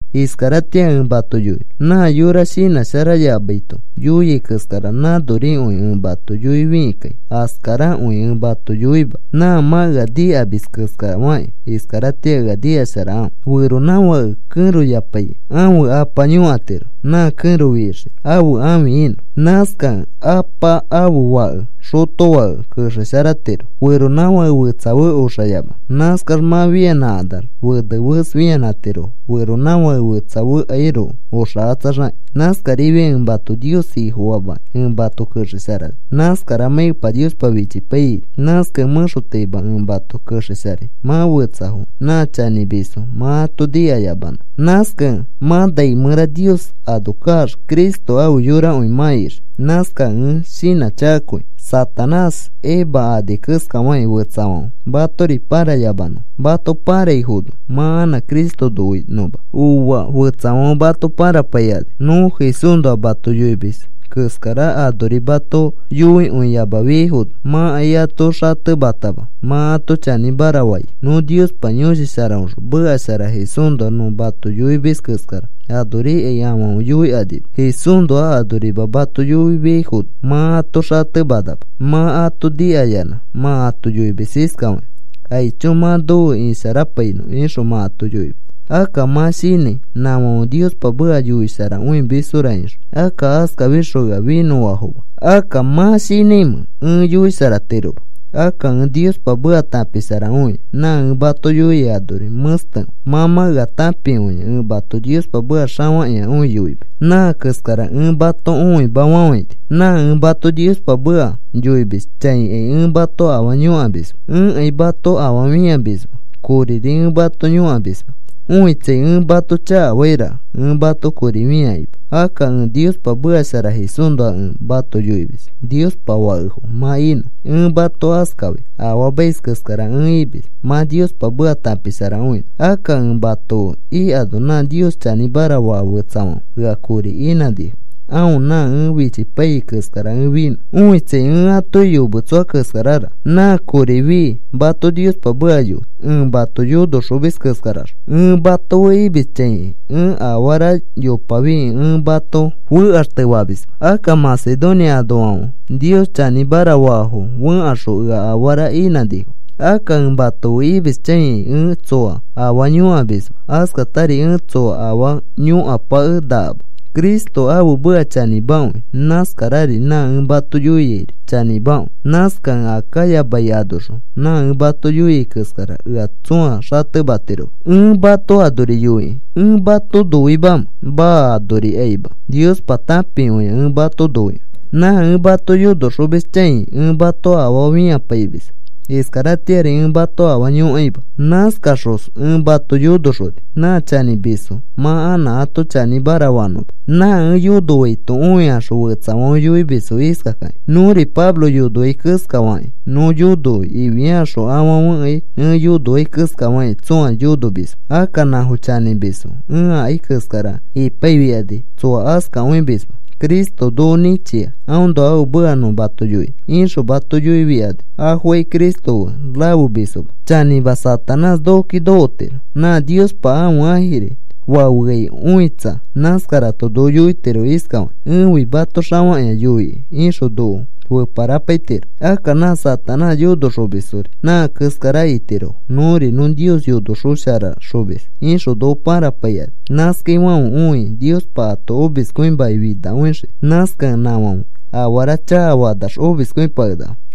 Iskaratĩa ẽ mato yoinõ, nã yora shinãsharayamaito yoiai keskara nãnorikõi ẽ mato yoifikĩkai askarakõi ẽ mato yoima. Nã mã ea nikamis keskafakĩ iskaratĩa ea nikasharakãfe. Feronãfãke kẽroyapaikĩ ãfe apa yõkatiro, nã kẽro fixiki ãfe ãfi inõ. Nãskakẽ apa ãfe fake xotofake kexesharatiro feronãfake fetsa fe oxayamanõ. Nãskax mã fianãkanax fene fes fianãtirofo feronãfake fetsafekairoko oxakatsaxakĩ. Nãskarifiakĩ ẽ mato Nios Ifofamakĩ ẽ mato kexesharani. Nãskaramãi Epa Niospa fichipaiyaino. Nãskakẽ mẽxotaima ẽ mato kexesharai mã fetsafo nã chanĩmisfo mã ato nikayamanõ. Nãskakẽ mã nai mẽra Nios ano kaax Cristo afe yorakõi mã ixii. Nãskakẽ ẽ shinãchakakõi Satanás Eva ani keskafakĩ fetsafãfe matori pãrayamanõfo, mato pãraifono mã anã Cristo noinõma. Ooa. Fetsafãfe mato pãrapaikani. Nõ Jesúsnoa mato yoimis keskara anori mato yoikõiyamafiaifono mãkai ato xatematama mã ato chanĩmara fai. Nõ Niospa Yõshi Sharaõxõ meka shara Jesúsnoa nõ mato yoimis keskara anorikai afãfe yoikanima. Jesúsnoa anorima mato yoifiaifono mã ato xatemanama. Mã ato nikayanã mã yoimis iskafakĩ: “Aicho, mã nofe isharapainõ,” ixõ mã ato yoimis. Akka mã shinãi nãfãfe Niospa meka yoisharakõimisfora ixõ. Akka askafikaxõ ea finõfafoma. Akka, ¿mã shinãimẽ ẽ yoisharatiroma? Akka ẽ Niospa meka tãpisharakõia. Nã ẽ mato yoiai anori mẽstekõi. Mã mã ea tãpikõia ẽ mato Niospa meka xafakĩakõi yoimis. Nã keskara ẽ mato õimafafãini. Nã ẽ mato Niospa meka yoimis chãikai ẽ mato afaa yõkamisma. Ẽkai mato afaa fĩamisma, koriri ẽ mato yõkamisma. Õitsai, ẽ mato chakafairaka ẽ mato kori fĩakĩma. Akka ẽ Niospa meka shara Jesúsnoa ẽ mato yoimis Niospa fakefo mã inõ. Ẽ mato askafai afaamais keskara ẽ imis mã Niospa meka tãpisharakõinõ. Akka ẽ mato fe ikano nã Nios chanĩmara faa fetsafãfe ea kori inãnifo aõ nã ẽ fichipaiyai keskara ẽ finõ. Õitsai, ẽ atoki yometsoa keskararaka nã kori fii mato Niospa meka yoi, ẽ mato yonoxomis keskaraxõ. Ẽ mato fe imis chãikai ẽ afara yopafikĩ ẽ mato fekaxtefamisma. Akka Macedonia anoafãfe Nios chanĩmara faafo fẽkaxõ ea afarafo inãnifo. Akka ẽ mato fe imis chãikai ẽ tsoa afaa yõkamisma. Askatari ẽ tsoa afaa yõkapakenakama. Cristo ãfe meka chanĩmakõi. Nãskarari nã ẽ mato yoiairi chanĩmakõi. Nãskakẽ Acaya mai anoxõ nã ẽ mato yoiai keskara ea tsõa xatematiroma. Ẽ mato anori yoikĩ, ¿ẽ mato noimamẽ? Maa. Anorikaima Niospa tãpikõia ẽ mato noikõi. Nã ẽ mato yonoxomis chãi ẽ mato afaa fĩapaimisma. Iskaratĩari ẽ mato afaa yõkaima. Nãskaxos ẽ mato yonoxoni nã chanĩmisfo mã anã ato chanĩmara fanõma. Nã ẽ yonoaito õikaxõ fetsafãfe yoimisfo iskakakĩ: “Nõri Pablo yonoai keskafakĩ nõ yonoi,” ifiakaxõ afãfekai ẽ yonoai keskafakĩ tsõa yonomisma. Akka nãfo chanĩmisfo. Ẽ ikai keskara ipaifikani tsoa askakõimisma. “Cristo noko nĩchia aõnoa ãfe meka nõ mato yoinõ,” ixõ mato yoifikani afokai Cristo fe rafemisfoma. Chanĩma, Satanás nokoki nokotiro nã Niospa ãfe ãjiri fafeai õitsa. Nãskarato noko yoitiro iskafakĩ: “Ẽfi mato xafakĩa yoikai,” ixõ noko feparapaitiro. Akka nã Satanás yonoxomisfori nã keskara itirofo. “Nõri nõ Nios yonosharaxomis,” ixõ noko pãrapaikani. Nãskaifãfe õikĩ Niospa ato omiskõimakĩ finakõixii. Nãskakẽ nãfãfe afara chakafakanax omiskõipakenakafo.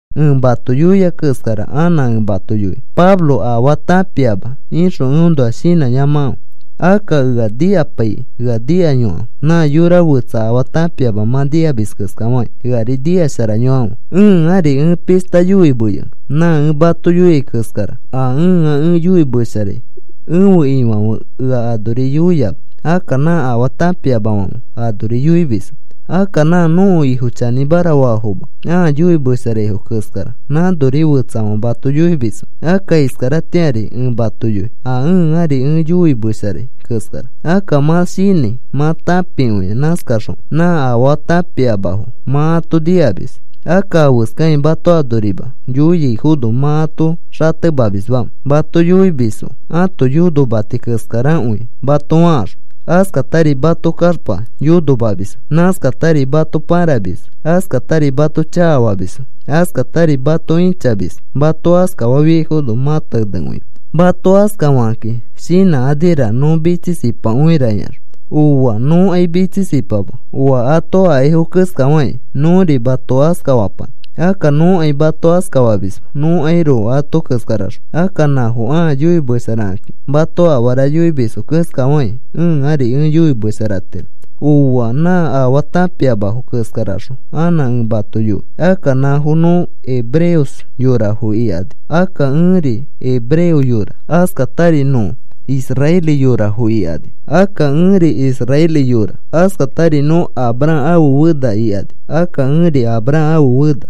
Ẽ mato yoia keskara anã ẽ mato yoinõ: “Pablo afaa tãpiama,” ixõ eõnoa shinãyamakãfe. Akka ea nikapaikĩ ea nikayokãfe. Nã yora fetsa afaa tãpiama mã nikamis keskafakĩ eari nikasharayokãfe. Ẽari ẽ pishta yoimeyonõ. Nã ẽ mato yoiai keskara a ẽa ẽ yoimesharai ẽfe Ifãfe ea anori yoiama. Akka nã afaa tãpiamafãfe anori yoimisfo. Akka nã nõko Ifo chanĩmara faafoma ãa yoimesharaifo keskara nãnori fetsafãfe mato yoimisfo. Akka iskaratĩari ẽ mato yoi a ẽari ẽ yoimesharai keskara. Akka mã shinãi mã tãpikõia. Nãskaxõ nã afaa tãpiamafo mã ato nikamis. Akka afeskakĩ mato anorima yoifiaifono mã ato xatemamisma. Mato yoimisfo ãto yonomati keskarakõi mato fakaxõ, askatari mato kaxpa yonomamisfo. Nãskatari mato pãramisfo, askatari mato chakafamisfo, askatari mato ĩchamisfo. Mato askafaifono mã tenekõimis. Mato askafakakĩ shinãkaniraka nõ mitsisipakõira ikaxõ. Ooa. Nõkai mitsisipama oa ato akaifo keskafakĩ nõri mato askafapanã. Akka nõkai mato askafamisma nõkairoko ato keskaraxõ. Akka nãfo ãa yoimesharakakĩ mato afara yoimisfo keskafakĩ ẽari ẽ yoimesharatiro. Ooa. Nã afaa tãpiamafo keskaraxõ anã ẽ mato yoi. Akka nãfo, “Nõ hebreos yorafo,” ikani. Akka ẽri hebreo yora. Askatari, “Nõ israeli yorafo,” ikani. Akka ẽri israeli yora. Askatari, “Nõ Abraham ãfe fena,” ikani. Akka ẽri Abraham ãfe fena.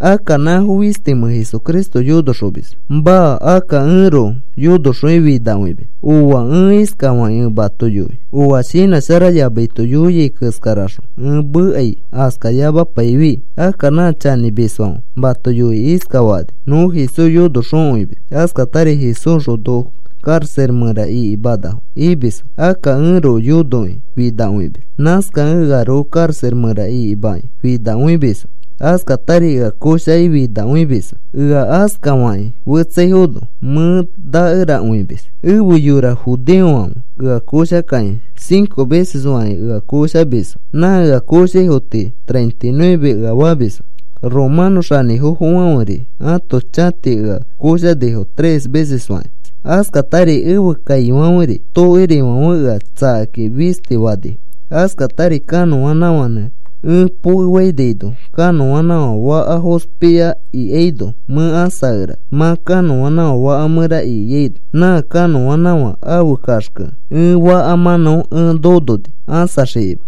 Akka, ¿nãfo fistimẽ Jesucristo yonoxomisfo? Maa. Akka ẽroko yonoxokĩ finakõimis. Ooa. Ẽ iskafakĩ ẽ mato yoi oa shinãsharayamaito yoiai keskaraxõ ẽ mekai askayamapaifi. Akka nã chanĩmisfãfe mato yoikĩ iskafakani: “Nõ Jesús yonoxokõimis. Askatari Jesúsxõ noko karaxa mẽra ikimanafo,” imisfo. Akka ẽroko yonokĩ finakõimis. Nãskakẽ earoko karaxa mẽra ikimakĩ finakõimisfo. Askatari ea koshakĩ finakõimisfo. Ea askafakĩ fetsaifono mẽ nakerakõimis. Efe yora judeofãfe ea koshakakĩ cinco veces fakĩ ea koshamisfo. Nã ea koshaifo tii treinta y nueve ea famisfo. Romano xanĩfofofãferi ãto chãti ea koshanifo tres veces fakĩ. Askatari ẽfe kaifãferi tokirifãfe ea tsakakĩ fisti fanifo. Askatari kanõanãfãnẽ ẽ pokefainaino kanõanãfã fakafã fospia ikiaino mẽ ãsakerani. Mã kanõanãfã fakafã mẽra ikiano nã kanõanãfã ãfe kaxke ẽ fakafã mãnão ẽ nononi ãsaxikima.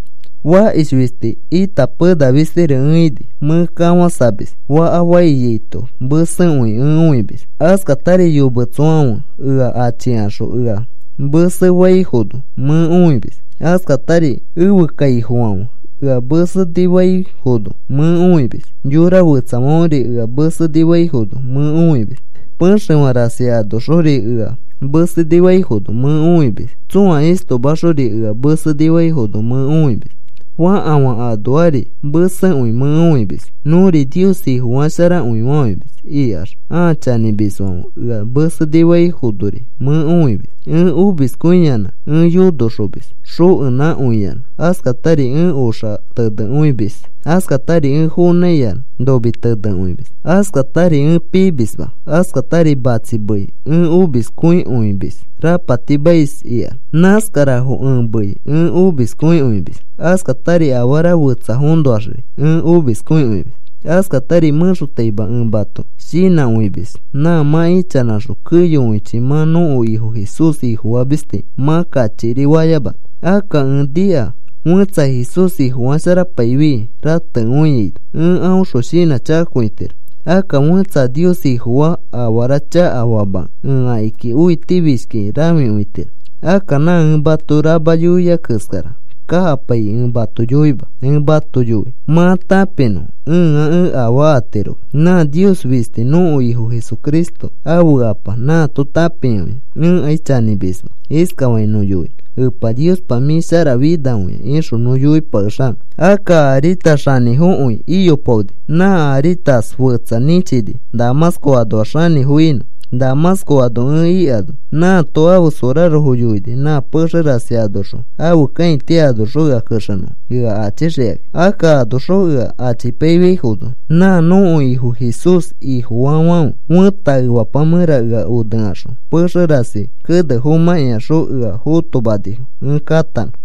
Fakish fisti ita pena fistiri ẽ ini. Mẽ kafãsamis, faka faiyaito mesekõi ẽ õimis; askatari yometsoafãfe ea achikaxõ ea mesenifaifono mẽ õimis; askatari ẽfe kaifokõifãfe ea mesenifaifono mẽ õimis; yora fetsafãferi ea mesenifaifono mẽ õimis; pexefã rasi anoxori ea mesenifaifono mẽ õimis; tsõa istomaxori ea mesenifaifono mẽ õimis; fakafã anoari mesekõi mẽ õimis; “Nõri Nios Ifo sharakõifamis,” ikax a chanĩmisfãfe ea mesenifaifonori mẽ õimis. Ẽ omiskõiyanã ẽ yonomis xokenãkõiyanã; askatari ẽ oxa tenekõimis; askatari ẽ fonãiyanã nomi tenekõimis; askatari ẽ pimisma; askatari matsi mei ẽ omiskõikõimis rapatimais ikax. Nãskarafo ẽ mei ẽ omiskõikõimis. Askatari afara fetsafoõnoaxri ẽ omiskõimis. Askatari mẽxotaima ẽ mato shinãkõimis nã mã ichanãxõ keyokõichi mã nõko Ifo Jesús Ifofamis tii mã kachikiri fayamanõ. Akka ẽ nika fẽtsa Jesús Ifofasharapaifi rateaino ẽ aõxõ shinãchakakõitiro. Akka fẽtsa a Nios Ifofaa afara chakafamakẽ ẽ akiki õitifishkikĩ rãfikõitiro. Akka nã ẽ mato rama yoiai keskara kakapaikĩ ẽ mato yoima. Ẽ mato yoi mã tãpinõ ẽa ẽ afaa atiroma. Nã Nios fisti nõko Ifo Jesucristo ãfe Apa, nãato tãpikõia ẽkai chanĩmisma. Iskafakĩ nõ yoinõ: “Epa Niospa, mĩ sharafinakõia,” ixõ nõ yoipakexanõ. Akka Aritas xanĩfokõi iyopaoni. Nã Aritas fetsa nĩchini Damasco anoax xanĩfo inõ. Damasco ano ẽ ikano, nãato ãfe sorarofo yoini nã pexe rasi anoxõ ãfe kãiti anoxõ ea kexenõfo ea achixikakĩ. Akka anoxõ ea achipaiyaifono, nã nõko Ifo Jesús Ifofaafãfe fẽta efapa mẽra ea onekaxõ pexe rasi kene fomãkĩaxõ ea fotomanifo ẽ katanõ.